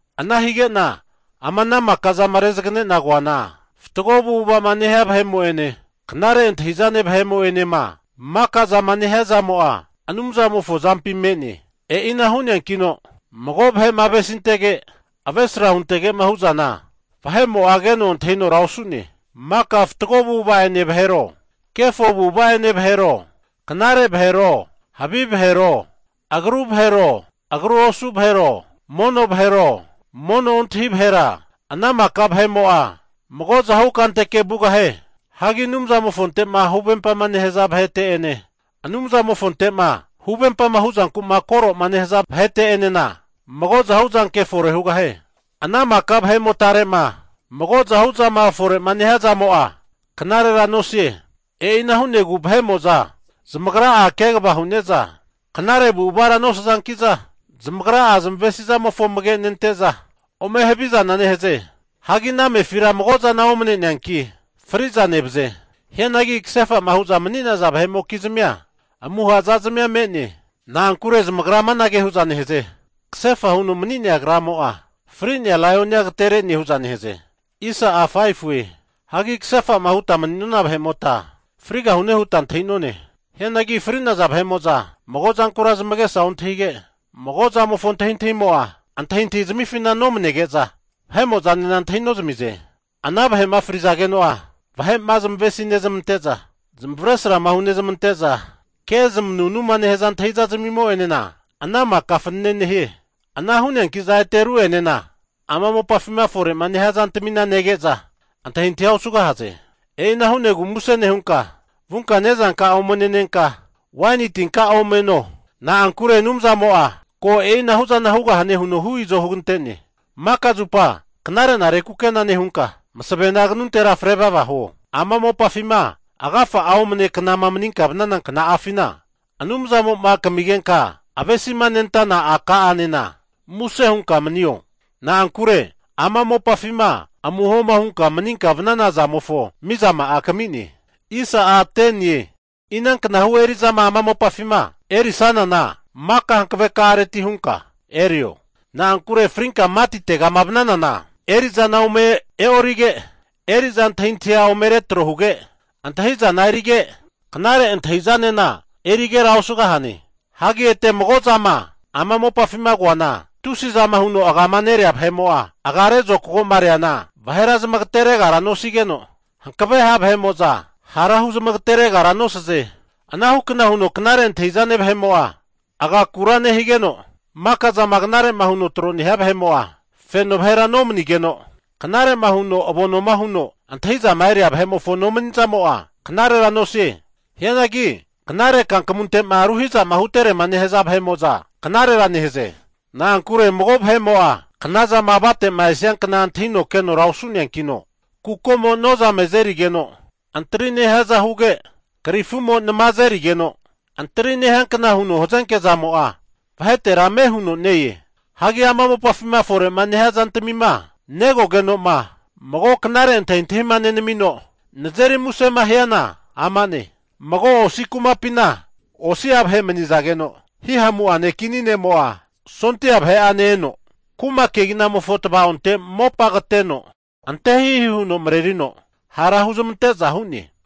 Ana hige'na ama ana maka zama rezaganena koana, fatgo avu'ava'ma nehia vahe'mo'ene knare antahi'zane vahe'mo'enema, maka zama neha'a zamo'a Anumzamofo azampi me'ne. E'ina hu'neankino mago vahe'ma avesintege avesra huntege'ma hu'zana vahe'mo'a keno antahinora osu'ne. Maka fatgo avu'ava'ene vahero, kefo avu'ava'ene vahero, knare vahero, havi vahero, agruhu vahero, agru osu vahero, mono vahero, mono ontahi vahera, ana maka vahe'mo'a mago'zahu kanteke vugahie. Hagi Anumzamofonte'ma huvempama nehaza vahete'ene Anumzamofonte'ma huvempama huzankuma koroma nehaza vahete'enena mago zahu zanke fore hugahie. Ana maka vahe'motare'ma mago zahu'zama fore'ma nehia zamo'a knarera nosie. E'ina hu'negu vahe'mo'za zamagra'a kegava hu'neza knare avu'avara nosazanki'za zamagra'a zamavesi'zamofo amage'nente'za, ome havizana nehaze. Hagi ana amefira mago'zana omane'neanki, fri'za nevaze. Hianagi kasefa'ma hu'za mani'naza vahe'mokizmia amuha zazmia me'ne. Na'ankure zamagra amanage hu'za nehaze, kasefa huno mani'nea kramo'a fri'nea laionia agatere'ne hu'za nehaze. Hagi kasefa'ma huta mani'nona vahe'mota, frigahune huta antahi'none. Hianagi fri'naza vahe'mo'za magozankura zamagesa ontahige, mago zamofo antahintahimo'a antahintahi zamifina nomanege'za, vahe'mo'zanena antahi nozamize. Ana vahe'ma fri'zageno'a vahe'ma zamavesi nezmante'za, zamavaresrama hunezmante'za, kezmanunuma nehaza antahintahi zamo'enena ana maka fanene nehie. Ana hu'neankiza ete ru'enena ama mopafima fore'ma nehia zantamina nege'za, antahintahia osugahaze. E'ina hu'negu muse nehunka vunka nezanka'a ome nenenka, waini tinka'a ome no, na'ankure Anumzamo'a ko e'inahuzana hugahane huno hu izo hugante'ne. Maka zupa knare'nare kukena nehunka, masavena kanuntera fre vava huo. Ama mopafima agafa'a omne knama maninka vanana kna'afina, Anumzamo'ma kamigenka avesima nentana a'ka'anena muse hunka manio. Na'ankure ama mopafima amuhoma hunka maninka vanana zamofo mizama'a kami'ne. Inanknahu eri'zama ama mopafima erisanana maka hankaveka'reti hunka erio. Na'ankure frinka matitega vananana eri'zana ome e'orige, eri'za antahintahia ome retro huge, antahi'zana erige knare antahi'zanena erigera osugahie. Hagi ete mago zama ama mopafima koana, tusi zama huno agama nerea vahe'mo'a agare zokago'ma reana, vahera zamagaterekera nosigeno, hankave ha' vahe'mo'za hara huzmagateregara nosaze. Anahukna huno knare antahi'zane vahe'mo'a agakura nehigeno, maka zama knare huno tro'ma nehia vahe'mo'a feno vahera nomanigeno, knare huno avonoma huno antahi'zama eria vahe'mofo nomani' zama'amo'a knarera nosie. Hianagi knare kankamunte'ma ruhiza'ma huterema nehaza vahe'mo'za knarera nehaze. Na'ankure mago vahe'mo'a knazama avate'ma esiankna antahino keno osu'neankino, kukomo nozame azerigeno antri nehiaza huge, krifumo nama azerigeno antri nehiankna huno hazenke zamo'a vahetera ame huno ne-e. Hagi ama mopafima fore'ma nehia zantmima negogeno'ma, mago knare antahintahima nenamino nazeri musema hiana ama'ne, mago osi kumapina osi'a vahe mani'nazageno, hihamu'ane kini ne'mo'a sondia vahe'ane eno kuma keginamofo tavaonte mopa kateno ante hihi huno marerino hara huzmante'za hu'ne.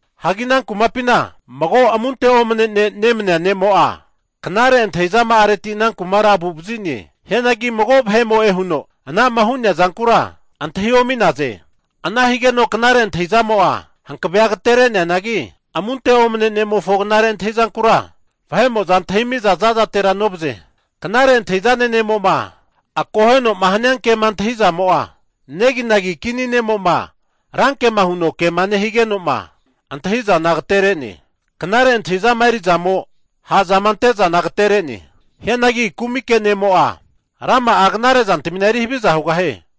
Hagi ana kumapina mago amunte omne ne' nemania ne'mo'a, knare antahizama'areti ana kumara agu'vazi'ne. Hianagi mago vahe'mo'e huno ana'ma hu'nea zankura antahi omi'naze. Ana higeno knare antahi'zamo'a hankavea agatere'neanagi, amunte omane ne'mofo knare antahizankura vahe'mo'za antahimi'za zazatera novaze. Knare antahi'zane ne'mo'ma akoheno'ma hania ke'ma antahi'zamo'a, neginagi kini ne'mo'ma ranke'ma huno kema nehigeno'ma antahi'zana agatere'ne. Knare antahi zama eri'zamo ha'zama ante zana agatere'ne. Hianagi kumike ne'mo'a rama'a knare'zantamina eri haviza hugahie.